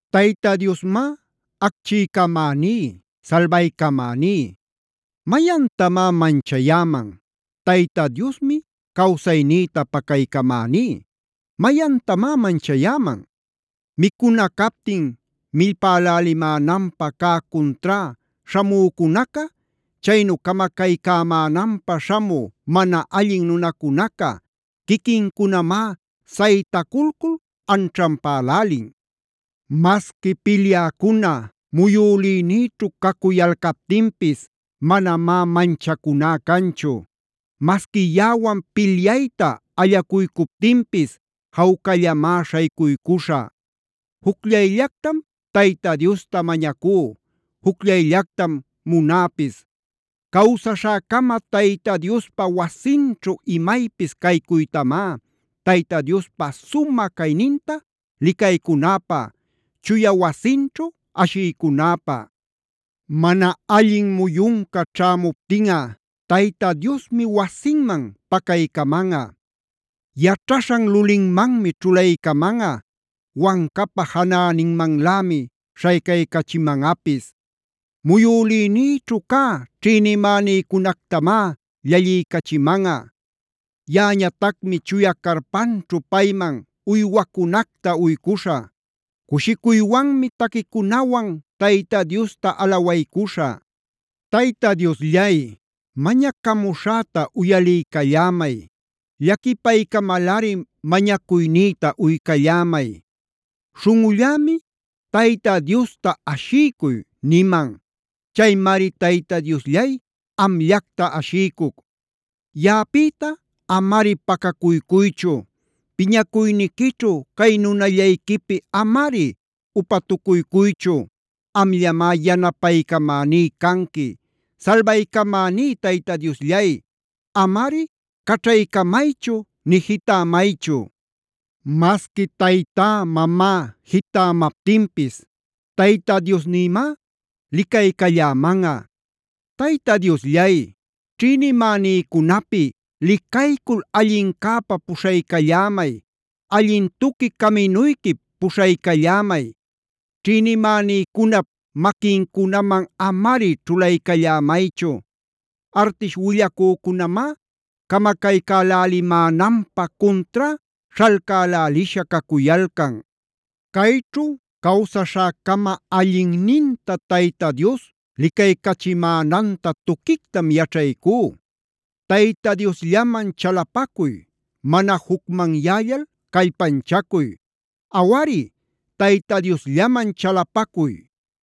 Tayta Diosmá, acchiycamäní, salbaycamäní. ¿Mayantamá manchayäman? Tayta Diosmi cawsaynïta pacaycamäní. ¿Mayantamá manchayäman? Micuna captin millpälälimänanpä cä cuntrá śhamücunaca, chaynu camacaycämänanpä śhamü mana allin nunacunaca quiquincunamá saytaculcul anćhanpälälin. Masqui pilyäcuna muyülïnïćhu cacuyalcaptinpis manamá manchacuná canchu. Masqui yaꞌawan pilyayta allacuycuptinpis jawcallamá śhaycuycuśhä. Jucllayllactam Tayta Diosta mañacú, jucllayllactam munäpis: Cawsaśhäcama Tayta Diospa wasinćhu imaypis caycuytamá,a Tayta Diospa sumä cayninta licaycunäpä, chuya wasinćhu ashiycunäpä. Mana allin muyunca ćhämuptinꞌa Tayta Diosmi wasinman pacaycamanꞌa. Yaćhaśhan lulinmanmi ćhulaycamanꞌa, wancapa janäninmanlämi śhaycaycachimanꞌapis. Muyülïnïćhu cä ćhïnimänïcunactamá llalliycachimanꞌa. Yaꞌañatacmi chuya carpanćhu payman uywacunacta uycuśhä. Cushicuywanmi taquicunawan Tayta Diosta alawaycuśhä. Tayta Diosllay, mañacamuśhäta uyaliycallämay. Llaquipaycamalꞌari mañacuynïta uycallämay. Śhunꞌullämi “Tayta Diosta ashiycuy” niman. Chaymari Tayta Diosllay amllacta ashiycuc. Yaꞌapïta amari pacacuycuychu. Piñacuyniquićhu cay nunallayquipi amari upatucuycuychu. Amllamá yanapaycamaní canqui. Salbaycamäní Tayta Diosllay, amari caćhaycamaychu nï jitämaychu. Masqui taytá-mamá jitämaptinpis Tayta Diosnïmá licaycallämanꞌa. Tayta Diosllay, ćhïnimänïcunapi licaycul allincäpa puśhaycallämay, allin tuqui caminuyquip puśhaycallämay. Ćhïnimänïcunap maquincunaman amari ćhulaycallämaychu. Artish willacücunamá camacaycälälimänanpä cuntrá śhalcälälisha cacuyalcan. Cayćhu cawsaśhäcama allinninta Tayta Dios licaycachimänanta tuquictam yaćhaycú. Tayta Diosllaman chalapacuy. Mana jucmanyällal callpanchacuy. Awari, Tayta Diosllaman chalapacuy.